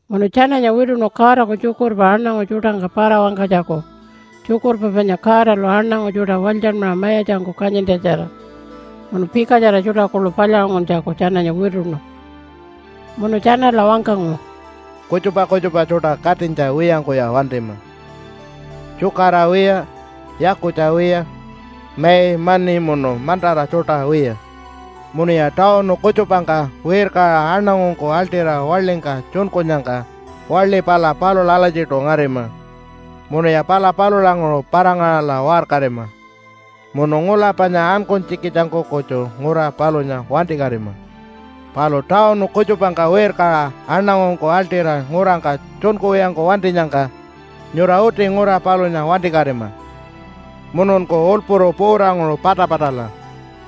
Munu tjananya wituṉu Godaku tjukurpa aṉangu tjuṯangka para-wangkanytjaku tjukurpa panya Godalu aṉangu tjuṯa walytjanmaṟa mayatjangku kanyintjatjara. Munu pikatjara tjuṯa kuḻu palyaṟunguntjaku tjananya wituṉu. Munu tjanala wangkangu, “Kutjupa kutjupa tjuṯa katinytja wiyangkuya wantima, tjukara wiya, yakutja wiya, mai, mani munu mantara tjuṯa wiya. Munuya tawunu kutjupangka wirkaṟa aṉangungku aḻṯira waḻingka tjunkunyangka, waḻi pala palula alatjiṯu ngarima, munuya pala palulanguṟu para-ngaṟala waṟkarima, munu ngula panya ankunytjikitjangku kutju ngura palunya wantikatima. Palu tawunu kutjupangka wirkaṟa aṉangungku aḻṯira ngurangka tjunkuwiyangku wantinyangka, nyura uti ngura palunya wantikatima, mununku ulpuru puutanguṟu patapatala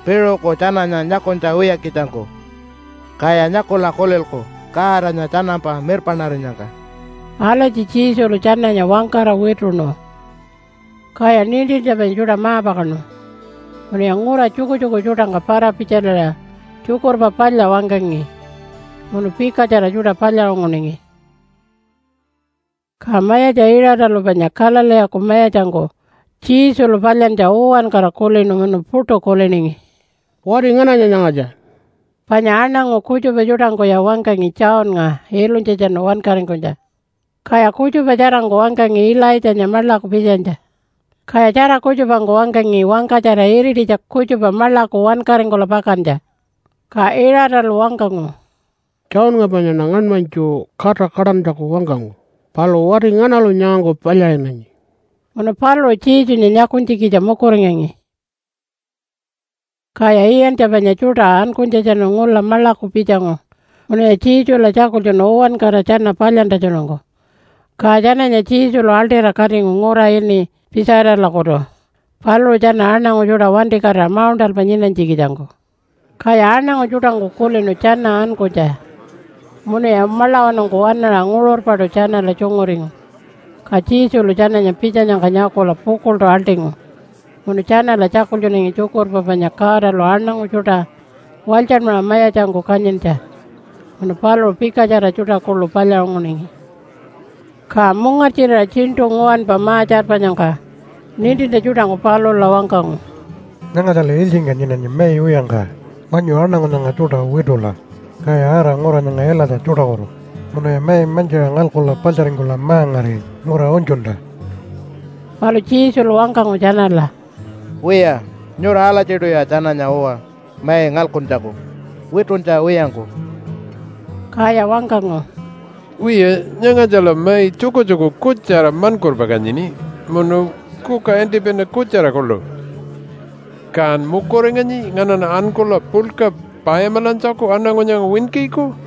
piṟuku tjananya nyakunytja wiyakitjangku. Kaya nyakula kulilku Godanya tjanampa mirpaṉarinyangka.” Alatji Jesulu tjananya wangkara wituṉu. Kaya nintintja panya tjuṯa ma-pakaṉu. Munuya ngura tjukutjuku tjuṯangka para-pitjaliṟa Tjukurpa Palya wangkangi munu pikatjara tjuṯa palyaṟunguningi. Ka mayatja Iṟatalu panya Galileeku mayatjangku Jesulu palyantja uwankara kulinu munu puṯu kuliningi, “Wati ngananya nyangatja?” Panya aṉangu kutjupa tjuṯangkuya wangkangi Johnnga ilunytjatjanu wankaringkunytja. Kaya kutjupa tjarangku wangkangi Ilaitjanya maḻaku pitjanytja, kaya tjara kutjupangku wangkangi wangkatjara irititja kutjupa maḻaku wankaringkula pakantja. Ka Iṟatalu wangkangu, “Johnnga panyaṉa ngaṉmanytju kata kaṯantjaku wangkangu. Palu wati nganalu nyangangku palyaṟinanyi?” Munu paluṟu Jesunya nyakunytjikitja mukuringangi. Kaya iyantja panya tjuṯa ankunytjatjanu ngula maḻaku pitjangu munuya Jesula tjakultjunu uwankara tjana palyantjatjanungku. Ka tjananya Jesulu aḻṯira katingu ngura ini Pitjaitalakutu paluṟu tjana aṉangu tjuṯa wantikatira mauṉṯalpa nyinanytjikitjangku. Kaya aṉangu tjuṯangku kulinu tjana ankunytja munuya maḻawanungku waṉaṟa nguṟurpaṯu tjanala tjunguringu. Ka Jesulu tjananya pitjanyangka nyakula pukuḻṯu aḻṯingu munu tjanala tjakultjunangi tjukurpa panya Godalu aṉangu tjuṯa walytjanmaṟa mayatjangku kanyintja. Munu paluṟu pikatjara tjuṯa kuḻu palyaṟunguningi. Ka mungartjirira tjiṉṯu nguwanpa ma-tjarpanyangka nintintja tjuṯangku palula wangkangu, “Nyangatjala ilytjingka nyinanyi mai wiyangka. Wanyu aṉangu nyanga tjuṯa witula, kaya ara ngura nyanga ilatja tjuṯakutu munuya mai mantjiṟa ngalkula paḻtjaringkula ma-ngari ngura unytjunta.” Palu Jesulu wangkangu tjanala, “Wiya, nyura alatjiṯuya tjananya uwa mai ngalkuntjaku wituntja wiyangku.” Kaya wangkangu, “Wiya, nyangatjala mai tjukutjuku kutjara maṉkurpa kanyini munu kuka antipina kutjara kuḻu. Kan mukuringanyi nganaṉa ankula puḻka payamilantjaku aṉangu nyanga winkiku?”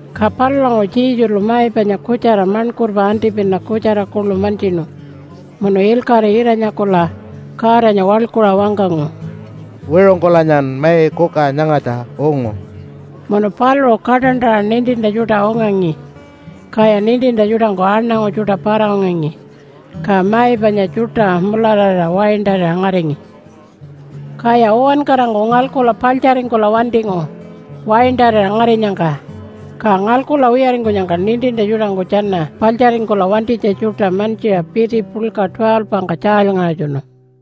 Ka palulanguṟu Jesulu mai panya kutjara maṉkurpa antipina kutjara kuḻu mantjinu munu ilkaṟi ira-nyakula Godanya waḻkuṟa wangkangu, “Wiṟungkulanyan mai kuka nyangatja ungu.” Munu paluṟu kaṯantaṟa nintintja tjuṯa ungangi. Kaya nintintja tjuṯangku aṉangu tjuṯa para-ungangi. Ka mai panya tjuṯa mulararira waintarira ngaringi. Kaya uwankarangku ngalkula paḻtjaringkula wantingu waintarira ngarinyangka. Ka ngalkula wiyaringkunyangka nintintja tjuṯangku tjana paḻtjaringkula wantinytja tjuṯa mantjiṟa piti puḻka 12-ngka tjaalyngaṟatjunu.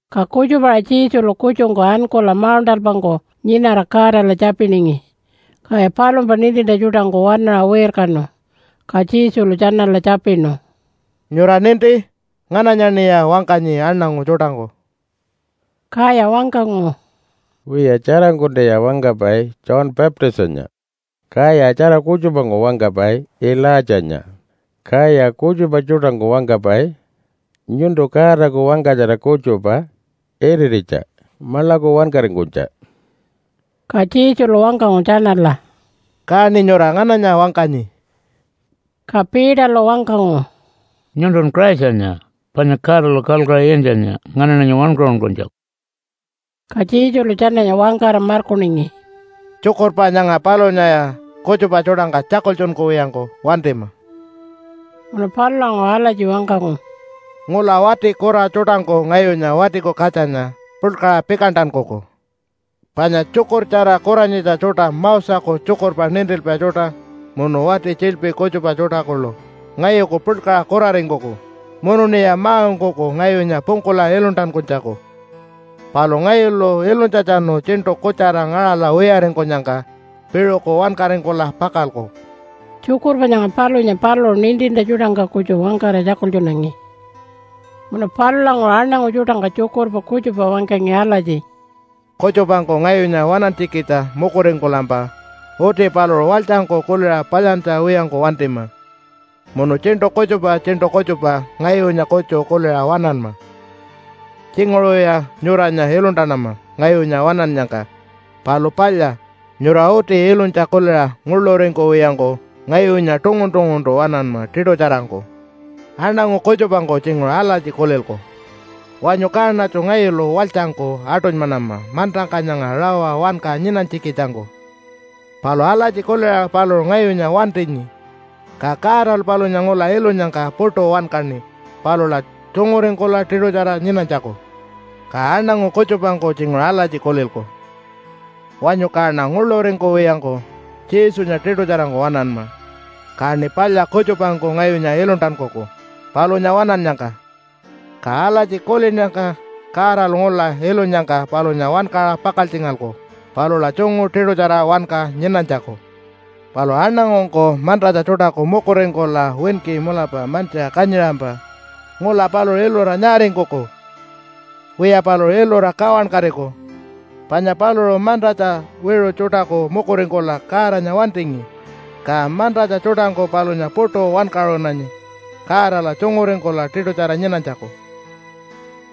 Ka kutjupa-aṟa Jesulu kutjungku ankula mauṉṯalpangku nyinara Godala tjapiningi. Kaya palumpa nintintja tjuṯangku waṉaṟa wirkanu. Ka Jesulu tjanala tjapinu, “Nyura ninti? Ngananyaṉiya wangkanyi aṉangu tjuṯangku?” Kaya wangkangu, “Wiya tjarangkuntaya wangkapai ‘John Baptistanya.’ Kaya tjara kutjupangku wangkapai ‘Ilaitjanya.’ Kaya kutjupa tjuṯangku wangkapai nyuntu Godaku wangkatjara kutjupa irititja maḻaku wankaringkunytja.” Ka Jesulu wangkangu tjanala, “Kaṉi nyura ngananya wangkanyi?” Ka Peterlu wangkangu, “Nyuntun Christanya, panya Godalu kalkuṟa iyantjanya nganaṉanya wankaṟunkunytjaku.” Ka Jesulu tjananya wangkara markuningi, “Tjukurpa nyanga palunyaya kutjupa tjuṯangka tjakultjunkuwiyangku wantima.” Munu palulanguṟu alatji wangkangu, “Ngula wati kura tjuṯangku ngayunya Watiku Katjanya puḻkaṟa pikantankuku. Panya tjukurtjara kuranyitja tjuṯa, Moseku tjukurpa nintilpai tjuṯa, munu wati tjiḻpi kutjupa tjuṯa kuḻu ngayuku puḻkaṟa kuraringkuku, munuṉiya ma-ungkuku ngayunya pungkula iluntankunytjaku. Palu ngayulu ilunytjatjanu tjiṉṯu kutjara ngaṟala wiyaringkunyangka piṟuku wankaringkula pakalku.” Tjukurpa nyanga palunya paluṟu nintintja tjuṯangka kutju wangkara tjakultjunangi. Munu palulanguṟu aṉangu tjuṯangka tjukurpa kutjupa wangkangi alatji, “Kutjupangku ngayunya waṉantjikitja mukuringkulampa uti paluṟu walytjangku kuliṟa palyantja wiyangku wantima, munu tjiṉṯu kutjupa tjiṉṯu kutjupa ngayunya kutju kuliṟa waṉanma. Tjinguṟuya nyuranya iluntanama ngayunya waṉannyangka, palu palya, nyura uti ilunytja kuliṟa nguḻuringkuwiyangku ngayunya tungun-tunguntu waṉanma tiṯutjarangku. Aṉangu kutjupangku tjinguṟu alatji kulilku, ‘Wanyu kaṉatju ngayulu walytjangku aṯunymanama mantangka nyanga rawa wanka nyinanytjikitjangku.’ Palu alatji kuliṟa paluṟu ngayunya wantinyi, ka Godalu palunya ngula ilunyangka puṯu wankaṉi palula tjunguringkula tiṯutjara nyinanytjaku. Ka aṉangu kutjupangku tjinguṟu alatji kulilku, ‘Wanyu kaṉa nguḻuringkuwiyangku Jesunya tiṯutjarangku waṉanma, kaṉi palya kutjupangku ngayunya iluntankuku palunya waṉannyangka.’ Ka alatji kulinnyangka Godalu ngula ilunyangka palunya wankaṟa pakaltjingalku palula tjungu tiṯutjara wanka nyinanytjaku. Palu aṉangungku mantatja tjuṯaku mukuringkula winki mulapa mantjiṟa kanyiṟampa ngula paluṟu ilura nyaaringkuku? Wiya, paluṟu ilura kawankatiku, panya paluṟu mantatja wiṟu tjuṯaku mukuringkula Godanya wantingi, ka mantatja tjuṯangku palunya puṯu wankaṟunanyi Godala tjunguringkula tiṯutjara nyinanytjaku.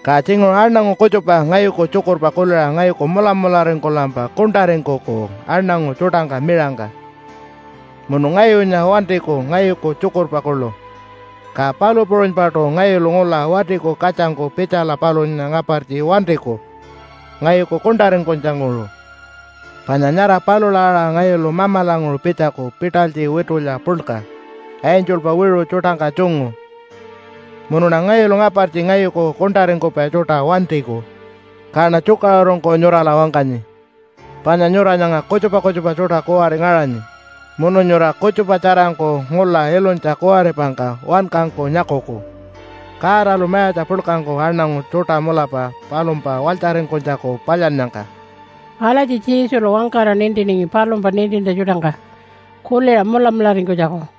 “Ka tjinguṟu aṉangu kutjupa ngayuku tjukurpa kuliṟa ngayuku mulamularingkulampa kuṉṯaringkuku aṉangu tjuṯangka miṟangka, munu ngayunya wantiku ngayuku tjukurpa kuḻu, ka palu puṟunypaṯu ngayulu ngula Watiku Katjangku pitjala palunya ngapartji wantiku ngayuku kuṉṯaringkunytjanguṟu. Panya nyara palula aṟa ngayulu Mamalanguṟu pitjaku pitalytji witulya puḻka, angelpa wiṟu tjuṯangka tjungu, munuṉa ngayulu ngapartji ngayuku kuṉṯaringkupai tjuṯa wantiku. Kaṉa tjukaṟurungku nyurala wangkanyi, panya nyura nyanga kutjupa kutjupa tjuṯa kuwari ngaṟanyi, munu nyura kutjupa tjarangku ngula ilunytja kuwaripangka wankangku nyakuku, Godalu mayatja puḻkangku aṉangu tjuṯa mulapa palumpa walytjaringkunytjaku palyannyangka.” Alatji Jesulu wangkara nintiningi palumpa nintintja tjuṯangka kuliṟa mulamularingkunytjaku.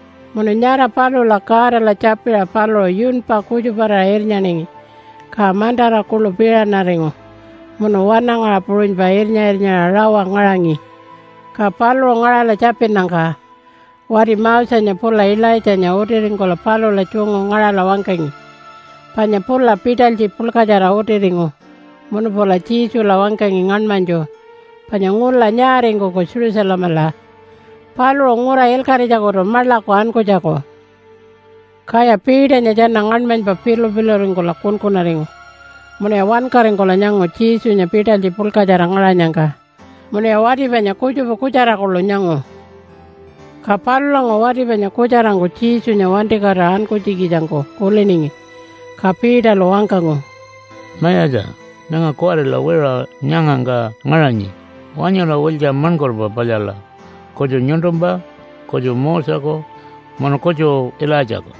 Munu nyara palula Godala tjapiṟa paluṟu yunpa kutjuparira irnyaningi, ka mantara kuḻu piṟanaringu munu wanangaṟa puṟunypa irnya-irnyaṟa rawa ngaṟangi. Ka paluṟu ngaṟala tjapinnyangka wati Mosenya pula Ilaitjanya utiringkula palula tjungu ngaṟala wangkangi. Panya pula pitalytji puḻkatjara utiringu munu pula Jesula wangkangi ngaṉmanytju panya ngula nyaaringkuku Jerusalemala paluṟu ngura ilkaṟitjakutu maḻaku ankunytjaku. Kaya Peternya tjana ngaṉmanypa pilu-piluringkula kunkunaringu munuya wankaringkula nyangu Jesunya pitalytji puḻkatjara ngaṟanyangka munuya wati panya kutjupa kutjara kuḻu nyangu. Ka palulanguṟu wati panya kutjarangku Jesunya wantikatira ankunytjikitjangku kuliningi, ka Peterlu wangkangu, “Mayatja, nyanga kuwarila wiṟuṟa nyangangka ngaṟanyi. Wanyula wiltja maṉkurpa palyala kutju nyuntumpa, kutju Moseku, munu kutju Ilaitjaku!”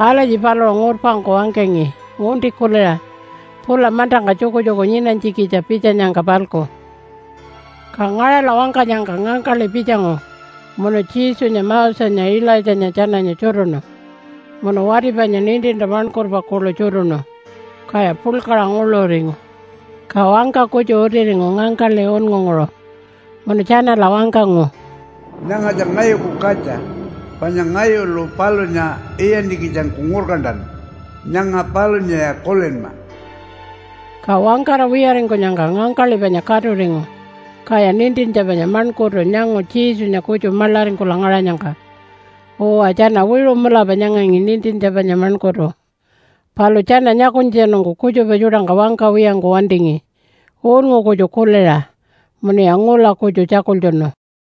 Alatji paluṟu ngurpangku wangkangi ngunti kuliṟa pula mantangka tjukutjuku nyinanytjikitja pitjanyangka-palku. Ka ngaṟala wangkanyangka ngangkaḻi pitjangu munu Jesunya Mosenya Ilaitjanya tjananya tjutuṉu munu wati panya nintintja maṉkurpa kuḻu tjutuṉu, kaya puḻkaṟa nguḻuringu. Ka wangka kutju utiringu ngangkaḻi unngunguṟu munu tjanala wangkangu, “Nyangatja ngayuku katja, panya ngayulu palunya iyantjikitjangku ngurkantanu. Nyanga palulaya kulinma!” Ka wangkara wiyaringkunyangka ngangkaḻi panya katuringu, kaya nintintja panya maṉkurtu nyangu Jesunya kutju maḻaringkula ngaṟanyangka. Uwa, tjana wiṟu mulapa nyangangi nintintja panya maṉkurtu, palu tjana nyakunytjatjanungku kutjupa tjuṯangka wangkawiyangku wantingi unngu kutju kuliṟa. Munuya ngula kutju tjakultjunu.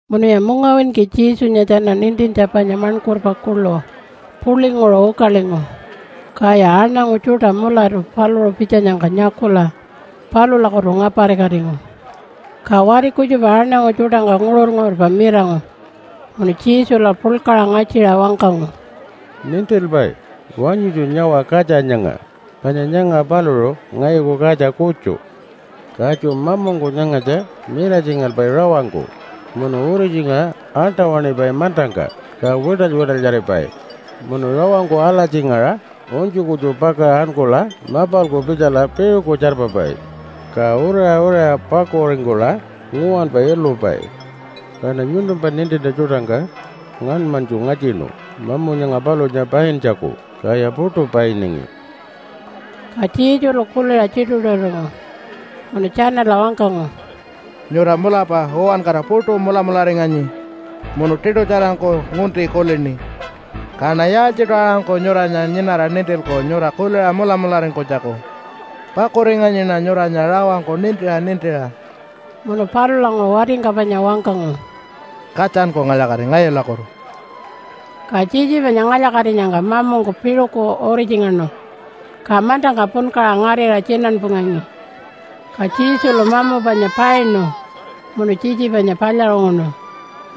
Munuya mungawinki Jesunya tjana nintintja panya maṉkurpa kuḻu puḻinguṟu ukalingu, kaya aṉangu tjuṯa mulatu paluṟu pitjanyangka nyakula palulakutu ngaparikatingu. Ka wati kutjupa aṉangu tjuṯangka nguṟur-nguṟurpa mirangu munu Jesula puḻkaṟa ngatjiṟa wangkangu, “Nintilpai! Wanyutju nyawa katja nyanga! Panya nyanga paluṟu ngayuku katja kutju. Katju mamungku nyangatja miratjingalpai rawangku munu uritjingaṟa aṉṯa-waṉipai mantangka, ka wiṯaly-wiṯalyaripai. Munu rawangku alatjingaṟa unytju kutju pakaṟa ankula mapalku pitjala piṟuku tjarpapai. Ka uriṟa uriṟa pakuringkula nguwanpa ilupai. Kaṉa nyuntumpa nintintja tjuṯangka ngaṉmanytju ngatjinu mamu nyanga palunya paintjaku, kaya puṯu painingi.” Ka Jesulu kuliṟa tjituṟu-tjituṟuringu munu tjanala wangkangu, “Nyura mulapa uwankara puṯu mulamularinganyi munu tiṯutjarangku ngunti kulini. Kaṉa yaaltjiṯu aṟangku nyuranya nyinara nintilku nyura kuliṟa mulamularingkunytjaku? Pakuringanyiṉa nyuranya rawangku nintiṟa nintiṟa.” Munu palulanguṟu watingka panya wangkangu, “Katjanku ngalya-kati ngayulakutu!” Ka tjitji panya ngalya-katinyangka mamungku piṟuku uritjingaṉu. Ka mantangka punkaṟa ngarira tjinanpungangi. Ka Jesulu mamu panya painu munu tjitji panya palyaṟunguṉu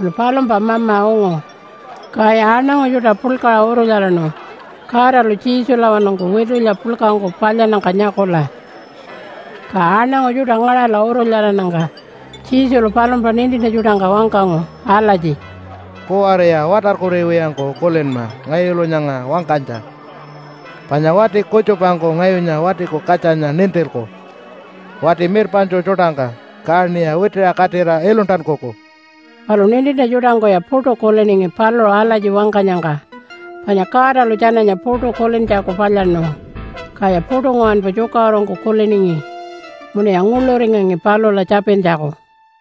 munu palumpa mama ungu. Kaya aṉangu tjuṯa puḻkaṟa urulyaraṉu Godalu Jesulawanungku witulya puḻkangku palyannyangka nyakula. Ka aṉangu tjuṯa ngaṟala urulyarannyangka Jesulu palumpa nintintja tjuṯangka wangkangu alatji, “Kuwariya watarkuriwiyangku kulinma ngayulu nyanga wangkanytja. Panya wati kutjupangku ngayunya Watiku Katjanya nintilku wati mirpaṉtju tjuṯangka, kaṉiya witiṟa katira iluntankuku.” Palu nintintja tjuṯangkuya puṯu kuliningi paluṟu alatji wangkanyangka, panya Godalu tjananya puṯu kulintjaku palyaṉu. Kaya puṯu nguwanpa tjukaṟurungku kuliningi munuya nguḻuringangi palula tjapintjaku.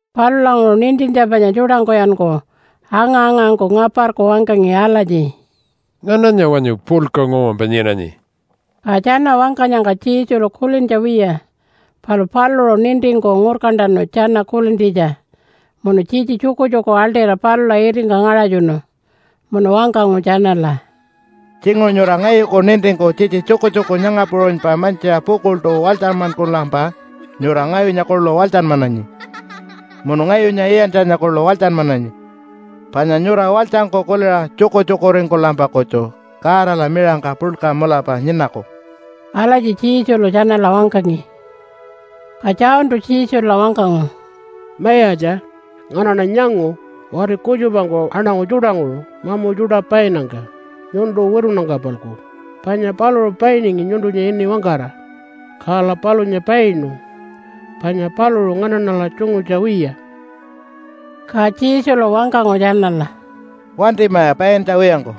Palulanguṟu nintintja panya tjuṯangkuyanku anga-angangku ngaparku wangkangi alatji, “Ngananya wanyu puḻka nguwanpa nyinanyi?” Ka tjana wangkanyangka Jesulu kulintja wiya, palu paluṟu nintingku ngurkantanu tjana kulintjitja munu tjitji tjukutjuku aḻṯira palula itingka ngaṟatjunu. Munu wangkangu tjanala, “Tjinguṟu nyura ngayuku nintingku tjitji tjukutjuku nyanga puṟunypa mantjiṟa pukuḻṯu walytjanmankulampa nyura ngayunya kuḻu walytjanmananyi, munu ngayunya iyantjanya kuḻu walytjanmananyi. Panya nyura walytjangku kuliṟa tjukutjukuringkulampa kutju Godala miṟangka puḻka mulapa nyinaku.” Alatji Jesulu tjanala wangkangi. Ka Johntu Jesula wangkangu, “Mayatja, nganaṉa nyangu wati kutjupangku aṉangu tjuṯanguṟu mamu tjuṯa painnyangka nyuntu witunnyangka-palku, panya paluṟu painingi nyuntunya ini wangkara. Kala palunya painu, panya paluṟu nganaṉala tjungutja wiya.” Ka Jesulu wangkangu tjanala, “Wantimaya paintja wiyangku!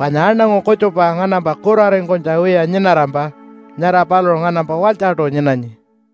Panya aṉangu kutjupa nganampa kuraringkunytja wiya nyinarampa nyara paluṟu nganampa walytjaṯu nyinanyi.”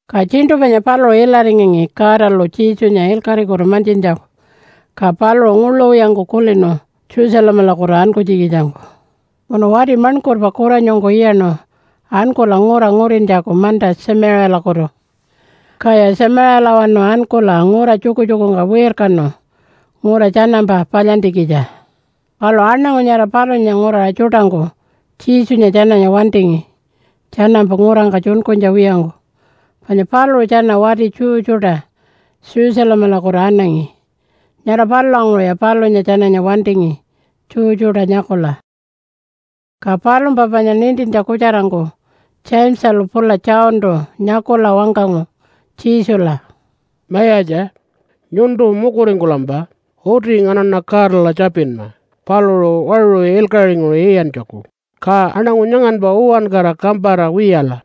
Ka tjiṉṯu panya paluṟu ilaringangi Godalu Jesunya ilkaṟikutu mantjintjaku, ka paluṟu nguḻu wiyangku kulinu Jerusalemalakutu ankunytjikitjangku. Munu wati maṉkurpa kuranyungku iyaṉu ankula ngura ngurintjaku manta Tjamiṟiyalakutu. Kaya Tjamiṟiyalawanu ankula ngura tjukutjukungka wirkanu ngura tjanampa palyantjikitja. Palu aṉangu nyara palunya nguraṟa tjuṯangku Jesunya tjananya wantingi tjanampa ngurangka tjunkunytja wiyangku, panya paluṟu tjana wati Jew tjuṯa Jerusalemalakutu anangi. Nyara palulanguṟuya palunya tjananya wantingi Jew tjuṯa nyakula. Ka palumpa panya nintintja kutjarangku Jamesalu pula Johntu nyakula wangkangu Jesula, “Mayatja, nyuntu mukuringkulampa uti nganaṉa Godala tjapinma paluṟu waṟu ilkaṟinguṟu iyantjaku, ka aṉangu nyanganpa uwankara kampara wiyala.”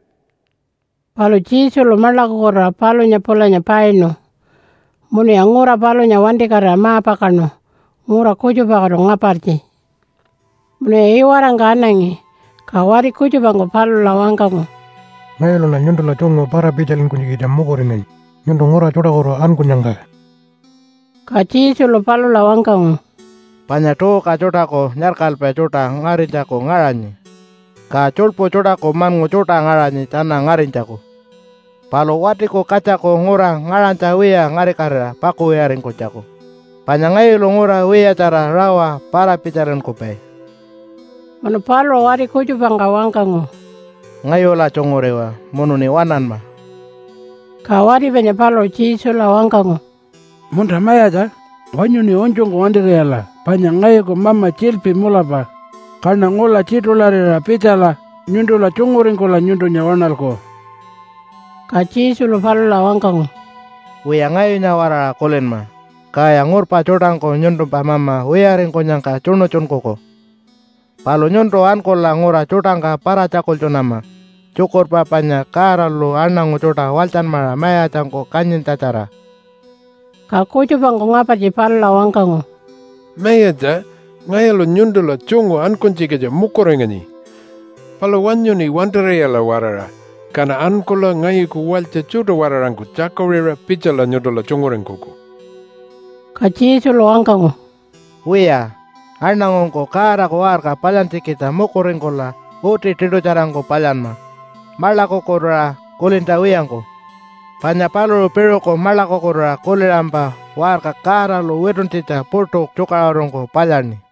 Palu Jesulu maḻakukutuṟa palunya pulanya painu. Munuya ngura palunya wantikatira ma-pakaṉu ngura kutjupakutu ngapartji. Munuya iwarangka anangi, ka wati kutjupangku palula wangkangu, “Ngayuluṉa nyuntula tjungu para-pitjalinkunytjikitja mukuringanyi nyuntu ngura tjuṯakutu ankunyangka.” Ka Jesulu palula wangkangu, “Panya tuuka tjuṯaku nyarkalpa tjuṯa ngarinytjaku ngaṟanyi. Ka tjuḻpu tjuṯaku maṉngu tjuṯa ngaṟanyi tjana ngarinytjaku, palu Watiku Katjaku ngura ngaṟanytja wiya ngarikatira pakuwiyaringkunytjaku. Panya ngayulu ngura wiyatjara rawa para-pitjalinkupai.” Munu paluṟu wati kutjupangka wangkangu, “Ngayula tjunguriwa munuṉi waṉanma!” Ka wati panya paluṟu Jesula wangkangu, “Munta Mayatja! Wanyuṉi unytjungku wantir'iyala, panya ngayuku mama tjiḻpi mulapa, kaṉa ngula tjiṯularira pitjala nyuntula tjunguringkula nyuntunya waṉalku.” Ka Jesulu palula wangkangu, “Wiya, ngayunya-waraṟa kulinma, kaya ngurpa tjuṯangku nyuntumpa mama wiyaringkunyangka tjuṉutjunkuku. Palu nyuntu ankula ngura tjuṯangka para-tjakultjunama tjukurpa panya Godalu aṉangu tjuṯa walytjanmaṟa mayatjangku kanyintjatjara.” Ka kutjupangku ngapartji palula wangkangu, “Mayatja, ngayulu nyuntula tjungu ankunytjikitja mukuringanyi. Palu wanyuṉi wantir'iyala-waraṟa, kaṉa ankula ngayuku walytja tjuṯa-waraṟangku tjakuṟiṟa pitjala nyuntula tjunguringkuku.” Ka Jesulu wangkangu, “Wiya, aṉangungku Godaku waṟka palyantjikitja mukuringkula uti tiṯutjarangku palyanma maḻakukutuṟa kulintja wiyangku. Panya paluṟu piṟuku maḻakukutuṟa kuliṟampa waṟka Godalu wituntjitja puṯu tjukaṟurungku palyaṉi.”